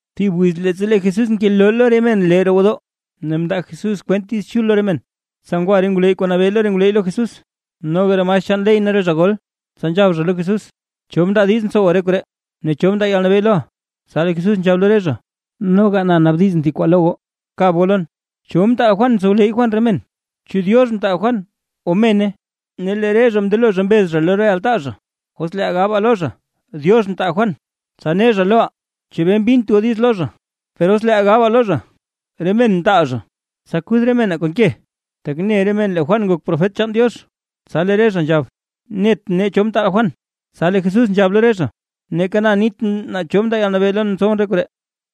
Thib wiz leettsa lee Jesús ngeloo lo re men lee roo gwodoo, ne mndaa Jesús kwent Diiz Chul lo re men, tsa ngwa re ngwleyy kuu nabee lo re ngwleyy lo Jesús, noga re maestr chaan ley ne re zha gol. Tsa nzhab zha lo Jesús: ―¿Cho mndaa diiz ntsowa re koree? Ne ¿cho mndaa yalnabee loʼa? Tsa lee Jesús nzhab lo re zha: ―Noga na naabdiz thib kwaa lo goo, kab goo lon. ¿Cho mtaal Juan tsowleyy Juan re men? ¿Chu Diox mtaal Juan o mene? Ne lee re zha mndelo zha mbez zha lo re altaa zha: ―Os leeʼaa gabaa lo zha: “Diox mtaal Juan”, tsa ne zha loʼaa: “¿Chebee mbint goo diiz lo zha?” Per os leeʼaa gabaa lo zha: “Re men mtaal zha”, tsa kuth re menaa kon ke, tak ne re men lee Juan nak profet chaan Diox. Tsa lee re zha nzhab: ―Net nee cho mtaal Juan. Tsa lee Jesús nzhab lo re zha: ―Neeka na nitʼn naa cho mndaa yalnabee lon ntsowʼn re koree.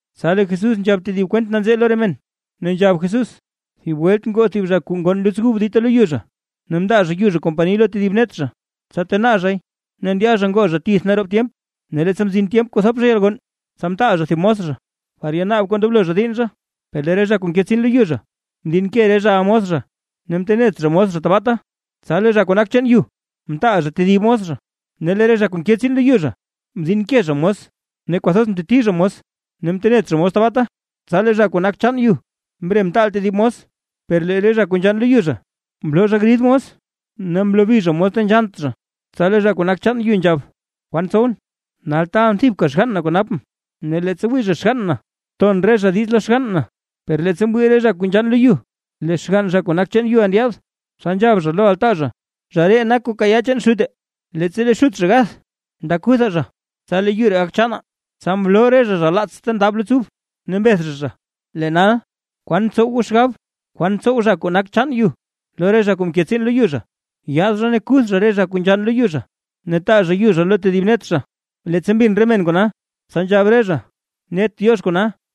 Tsa lee Jesús nzhab tedib kwent nanzee lo re men, ne nzhab Jesús: ―Thib welt ngoo thib zha kuu ngonn luts ub dita lo yu zha, ne mndaa zha yu zha kompani lo tedib net zha tsa tenaa zhay, ne ndya zha ngoo zha tith naroob tyemp. Ne leettsa mzin tyemp kuu thop zha yalgonn, tsa mtaal zha thib mos zha, par yanaab kuu ndoblo zha diinn zha. Per lee re zha kuu nke tsiin lo yu zha, mdinke re zhaʼa mos zha, ne mtenet zha mos tabaata. Tsa lee zha kuu nak chaan yu mtaal zha tedib mos zha, ne lee re zha kuu nke tsiin lo yu zha, mdinke zha mos ne kwathoz mteti zha mos ne mtenet zha mos tabaata. Tsa lee zha kuu nak chaan yu mre mtaal tedib mos, per lee re zha kuu nzhann lo yu zha, mloo zha grid mos, ne mlobi zha mos ta nzhannt zha. Tsa lee zha kuu nak chaan yu nzhab: “¿Kwan tsowʼn? Nal taalʼn thibka xgann na kuu napʼn; ne leettsa wii zha xgann na, ton re zha diiz lo xgann na.” Per leettsa mwii re zha kuu nzhann lo yu lee xgann zha kuu nak chaan yuʼa ndyaad, tsa nzhab zha lo altaa zha: “Zha ree nak kuu kayaa dita chaan xute, leettsa lee xut zha gath. Nda kutha zha, tsa lee yu ree gak chaanaa”. Tsa mloo re zha zha laats ta ndab luts ub ne mbeth zha zha. Tsa mnabdiz Jesús ne nzhab Jesús: ―¿Kwan ntsow goo xgab? ¿Kwan tsow zha kuu nak chaan yu lo re zha kuu mke tsiin lo yu zha? Yaad zha ne kuth zha re zha kuu nzhann lo yu zha, ne taa zha yu zha lo tedib net zha. Leettsa mbin re men kona, tsa nzhab re zha: ―¡Net Diox kona!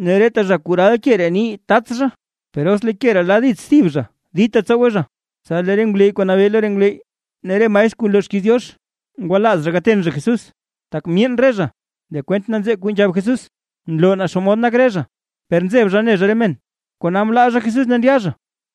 Ne reta zha kuu ral ke ree nii tats zha, per os lee ke ree la dits thib zha dita tsowe zha. Tsa lee re ngwleyy kuu nabee lo re ngwleyy ne re maestr kuu nloo xkiiz Diox, ngwalaaz zha gaten zha Jesús, tak myeen re zha lee kwent nanzee kuu nzhab Jesús, nloo naa xomod nak re zha. Per nzeb zha ne zha re men, kona mlaa zha Jesús ne ndya zha.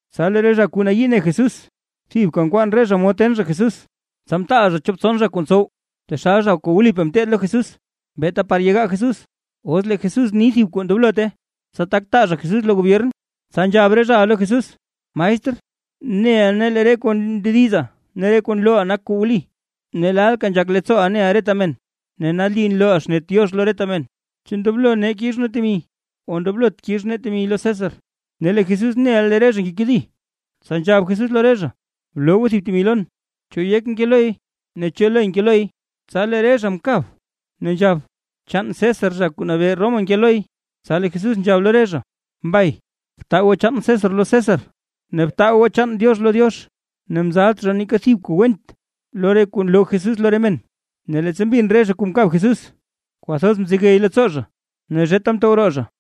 Tsa lee re zha kuu nayii ne Jesús thibka nkwaan re zha mod ten zha Jesús. Tsa mtaal zha chop tson zha kuu ntsow taxal zha kuu wlipaa ngeteed lo Jesús, beeta par yegaa Jesús, os lee Jesús ni thib kuu ndoblote, tsa tak taa zha Jesús lo gobyern. Tsa nzhab re zhaʼa lo Jesús: ―Maestr, neʼa nee lee re kuu ndediza ne re kuu nlooʼa nak kuu wli, ne lalka nzhak leettsooʼa neʼa reta men, ne nali nlooʼa xnet Diox lo re men. ¿Chu ndoblo kix nee temi o ndoblot kix nee temi lo César? Ne lee Jesús neʼa lee re zha ngekedi, tsa nzhab Jesús lo re zha: ―Bloo goo thib temi lon. ¿Cho yek nke loy? ¿Ne cho le nke loy? Tsa lee re zha mkab, ne nzhab: ―Chaan César, zha kuu nabee Roma nke loy. Tsa lee Jesús nzhab lo re zha: ―Mbay, btaa goo chaan César lo César, ne btaa goo chaan Diox lo Diox. Ne mzalt zha neeka thib kuu went lo re kuu nloo Jesús lo re men. Ne leettsa mbin re zha kuu mkab Jesús, kwathoz mzegey leettsoo zha ne zheta mtow roo zha.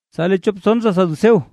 Tsa lee chop tson zha saduceo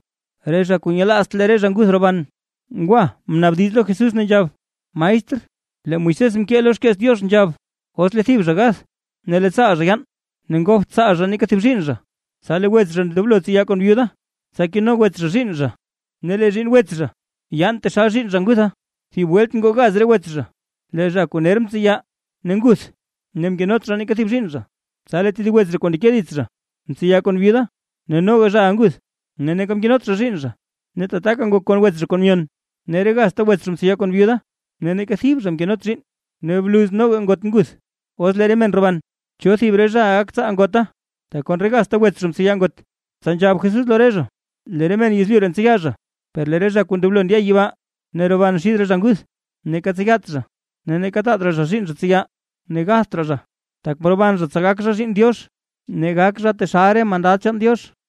re zha kuu nyelaazt lee re zha nguth roban, ngwa mnaabdiz lo Jesús, ne nzhab: ―Maestr, lee Moisés mkee lo xkeets Diox nzhab: “Os lee thib zha gath, ne lee tsaal zha yaan ne ngopt tsaal zha neeka thib zhiinn zha, tsa lee wets zha ndoblo tseya kon byuda, tsa keno wets zha zhiinn zha, ne lee zhiinn wets zha yaan taxal zhiinn zha ngutha”. Thib welt ngoo gaz re wets zha. Lee zha kuu ner mtseya, ne nguth. Ne mkenot zha neeka thib zhiinn zha. Tsa lee tedib wets zha kuu ndeke dits zha, mtseya kon byuda, ne noga zhaʼa nguth, ne neeka mkenot zha zhiinn zha. Ne tataka ngok kon wets zha kuu myon. Ne re gazta wets zha mtseya kon byuda ne neeka thib zha mkenot zhiinn. Ne bluz noga ngot nguth. Os lee re men roban, ¿cho thib re zhaʼa gak tsaal ngota, tak kon re gazta wets zha mtseya ngot? Tsa nzhab Jesús lo re zha: ―Lee re men yezlyu ree ntseya zha. Per lee re zha kuu ndoblo ndya yibaa ne roban xid zha nguth, neeka tseyat zha ne neeka taat raa zha zhiinn zha tseya. Ne gatht raa zha, tak mroban zha tsa gak zha zhiinn Diox, ne gak zha taxal re mandad chaan Diox.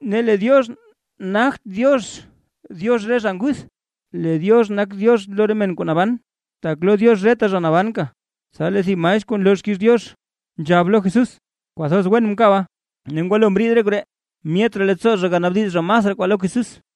¡Ne lee Diox nagt Diox Diox re zha nguth, lee Diox nak Diox lo re men kuu naban, tak lo Diox reta zha naban! Tsa lee thib maestr kuu nloo xkiiz Diox, nzhab lo Jesús: ―¡Kwathoz wen mkaba! Ne ngwalo mriid re koree, myet raa leettsoo zha ganaabdiz zha masraa kwaa lo Jesús.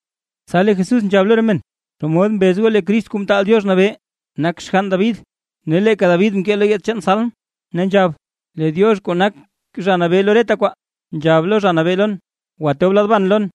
Tsa lee Jesús nzhab lo re men: ―¿Xomod mbez goo lee Crist Kuu Mtaal Diox Nabee nak xgann David? Ne leeka David mkee lo yeets chaan salm, ne nzhab: Lee Diox kuu nak Zha Nabee lo reta kwaa, nzhab lo Zha Nabee lon: “Btob lad ban lon,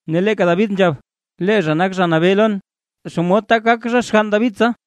’Ne leeka David nzhab: “Lee zha nak: Zha Nabee lon”. ¿Xomod tak gak zha xgann David tsa?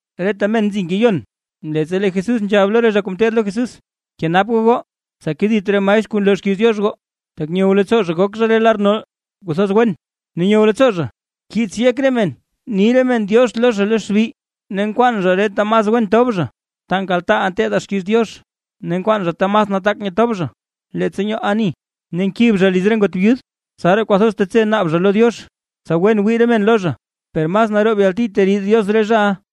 Reta men nzi ngeyon leettsa lee Jesús nzhab lo re zha kuu ngeteed lo Jesús: ―Kenap goo goo, tsa kedit re maestr kuu nloo xkiiz Diox goo, tak nyow leettsoo zha gok zha re lar nol kuu kwathoz wen, ne nyow leettsoo zha kiits yek re men ni re men “diox” lo zha lo xbi. Ne nkwaan zha re ta mas wen tob zha ta nkaltaaʼaa nteedaa xkiiz Diox, ne nkwaan zha ta mas nataak nyetob zha leettsa nyoo ani. Ne nkib zha liz re ngot byud. Tsaraa kwathoz tetse naab zha lo Diox, tsa wen wii re men lo zha. ¡Per mas naroob yalti teriid Diox re zhaʼa!